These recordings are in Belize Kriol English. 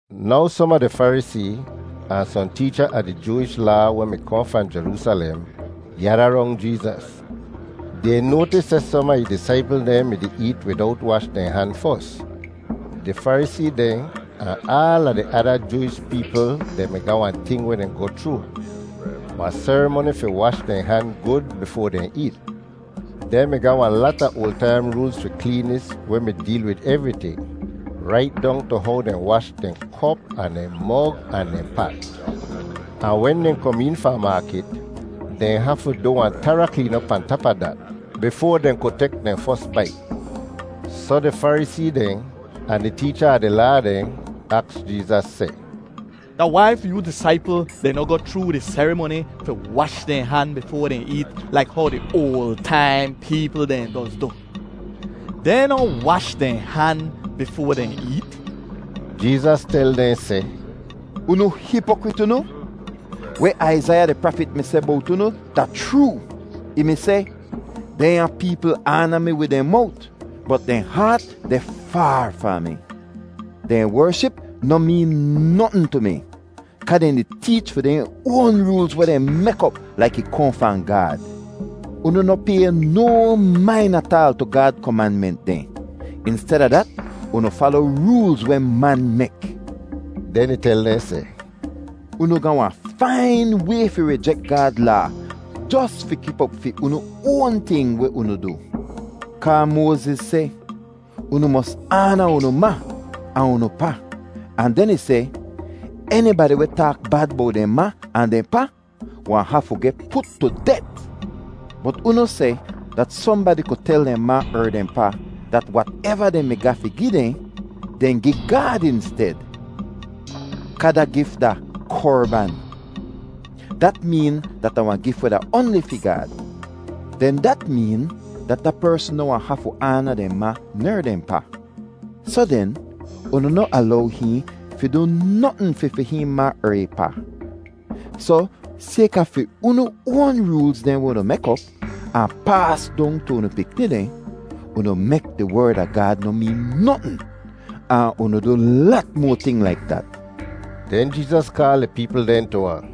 Now som a di Farisee ahn sohn teecha a di Jooish Laa weh mi kohn fahn Jeroosalem gyada rong Jeezas. Dehn noatis seh som a ih disaipl dehn mi-di eet widowt wash dehn han fos. (Di Farisee dehn ahn aala di ada Jooish peepl dehn mi ga wahn ting weh dehn goh chroo, wahn serimoni fi wash dehn han gud bifoa dehn eet. Dehn mi ga wahn lata oal taim roolz fi kleenis weh mi deel wid evriting, rait dong tu how dehn wash dehn kop ahn dehn mog ahn dehn pat. Ahn wen dehn kom een fahn maakit, dehn hafu du wahn tara kleen op pahn tap a dat, bifoa dehn ku tek dehn fos bait.) Soh di Farisee dehn ahn di teecha a di Laa dehn aks Jeezas seh, “Da wai fi yoo disaipl dehn noh goh chroo di serimoni fi wash dehn han bifoa dehn eet laik how di oal taim peepl dehn doz du? Dehn noh wash dehn han bifoa dehn eet.” Jeezas tel dehn seh, “Unu hipokrit unu! Weh Aizaiya di prafit mi seh bowt unu da chroo. Ih mi seh, ‘Dehnya peepl aana mi wid dehn mowt, bot dehn haat deh faar fahn mi. Dehn wership noh meen notn tu mi kaa dehn di teech fi dehn oan roolz, weh dehn mek op laik ih kohn fahn Gaad.’ Unu noh pay no main ataal tu Gaad komanment dehn. Insteda dat, unu fala roolz weh man mek.” Den ih tel dehn seh, “Unu ga wahn fain way fi rijek Gaad Laa jos fi kip op fi unu oan ting weh unu du. Kaa Moaziz seh, ‘Unu mos aana unu ma ahn unu pa,’ ahn den ih seh, ‘Enibadi weh taak bad bowt dehn ma ahn dehn pa wahn hafu geh put tu det.’ Bot unu seh dat sohnbadi ku tel dehn ma er dehn pa dat wateva dehn mi ga fi gi dehn, dehn gi Gaad insted, kaa da gif da ‘Korban’ (dat meen da wahn gif weh da oanli fi Gaad). Den dat meen dat da persn noh wahn hafu aana dehn ma ner dehn pa. Soh den, unu noh alow hihn fi du notn fi fi hihn ma er ih pa. Soh sayka fi unu oan roolz dehn weh unu mek op ahn paas dong tu unu pikni dehn, unu mek di Werd a Gaad noh meen notn; ahn unu du lat moa ting laik dat.” Den Jeezas kaal di peepl dehn tu ahn,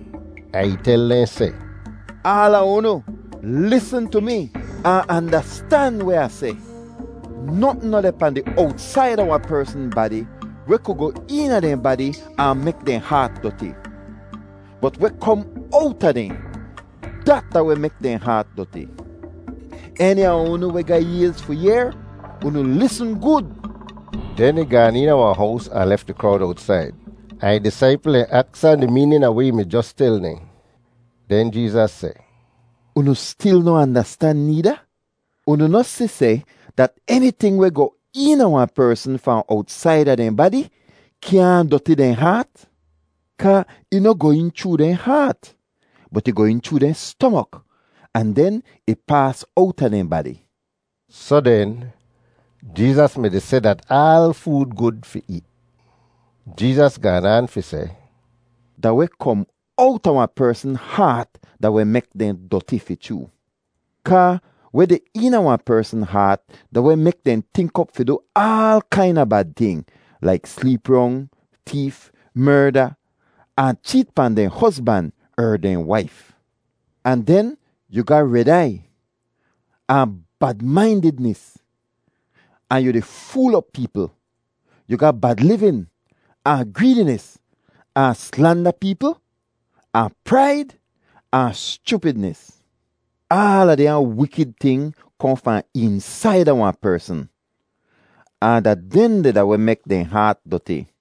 ahn ih tel dehn seh, “Aala unu lisn tu mi ahn andastan weh Ah seh. Notn noh deh pahn di owtsaida wahn persn badi weh ku goh eena dehn badi ahn mek dehn haat doti, bot weh kom owta dehn, dat da weh mek dehn haat doti. [Eni a unu weh ga ayz fi yehr, unu lisn gud!]” Den ih gaan eena wahn hows ahn lef di krowd owtsaid. Ahn ih disaipl dehn aks ahn di meenin a weh ih mi jos tel dehn. Den Jeezas seh, “Unu stil noh andastan needa? Unu noh si seh dat eniting weh goh eena wahn persn fahn owtsaida dehn badi kyaahn doti dehn haat? Kaa ih noh goh een chroo dehn haat, bot ih goh een chroo dehn stomok ahn den ih paas owta dehn badi.” (Soh den, Jeezas mi-di seh dat aal food gud fi eet.) Jeezas gaan aan fi seh, “Da weh kom owta wahn persn haat da weh mek dehn doti fi chroo. Kaa weh deh eena wahn persn haat da weh mek dehn tink op fi du aal kaina bad ting, laik sleep rong, teef, merda, ahn cheet pahn dehn hozban er dehn waif; ahn den yu ga red aiy, ahn bad-maindidnis, ahn yu di fool op peepl; yu ga bad livin, ahn greedinis, ahn slanda peepl, ahn praid, ahn schupidnis. Aala dehnya wikid ting kohn fahn eensaida wahn persn, ahn da dehndeh da weh mek dehn haat doti.”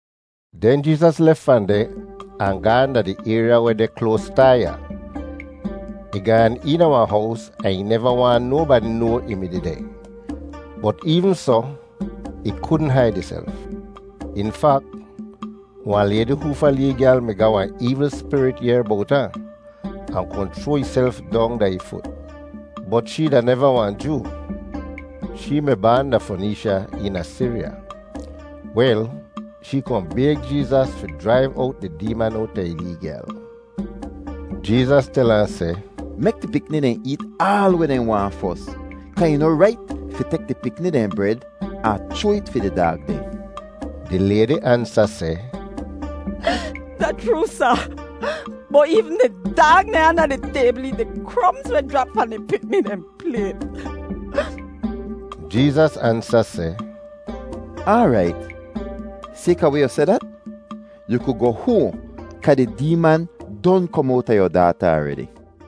Den Jeezas lef fahn deh ahn gaahn da di ayrya weh deh kloas Taiya. Ih gaan eena wahn hows ahn ih neva waahn nobadi noa ih mi dehdeh; bot eevn soh, ih kudn haid ihself. In fak, wahn laydi hoofa lee gyal mi ga wahn eevl spirit yehr bowt ahn, ahn kohn chroa ihself dong da ih fut. Bot shee da neva wahn Joo. Shee mi baan da Foneesha eena Siriya. Wel, shee kohn bayg Jeezas fi jraiv owt di deeman owta ih lee gyal. Jeezas tel ahn seh, “Mek di pikni dehn eet aal weh dehn waahn fos kaa ih noh rait fi tek di pikni dehn bred ahn chroa it fi di daag dehn.” Di laydi ansa seh, “Da chroo, Sa, bot eevn di daag dehn anda di taybl eet di kromz weh jrap fahn di pikni dehn playt.” Jeezas ansa seh, “Aarait, sayka weh yu seh dat, yu ku goh hoahn kaa di deeman don kom owta yu daata aredi.”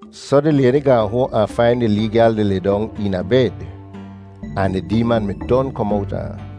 Soh di laydi gaahn hoahn ahn fain di lee gyal di lidong eena bed, ahn di deeman mi don kom owta ahn.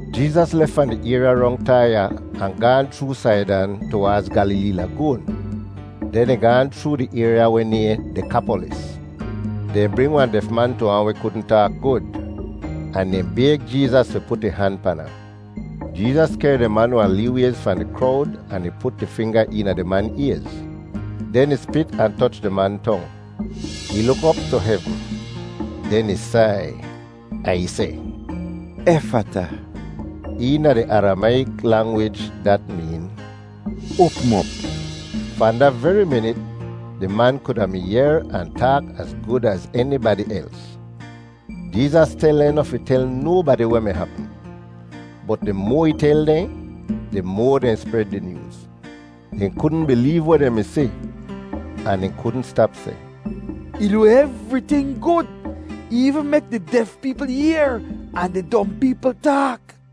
Jeezas lef fahn di ayrya rong Taiya ahn gaahn chroo Saidan tuwaadz Gyalilee Lagoon. Den ih gaahn chroo di ayrya weh nayhn Dekapolis. Dehn bring wahn def man tu ahn weh kudn taak gud, ahn dehn bayg Jeezas fi put ih han pan ahn. Jeezas kehr di man wahn lee wayz fahn di krowd ahn ih put ih finga eena di man ayz; den ih spit ahn toch di man tong. Ih luk op tu hevn, den ih sai ahn ih seh, “Efata!” (Eena di Aramayik langwij dat meen “Oapm op!”) Fahn da veri minit di man kuda mi yehr ahn taak az gud az enibadi els. Jeezas tel dehn noh fi tel nobadi weh mi hapm. Bot di moa ih tel dehn, di moa dehn spred di nyooz. Dehn kudn bileev weh dehn mi si, ahn dehn kudn stap seh, “Ih du evriting gud! Ih eevn mek di def peepl yehr ahn di dom peepl taak!”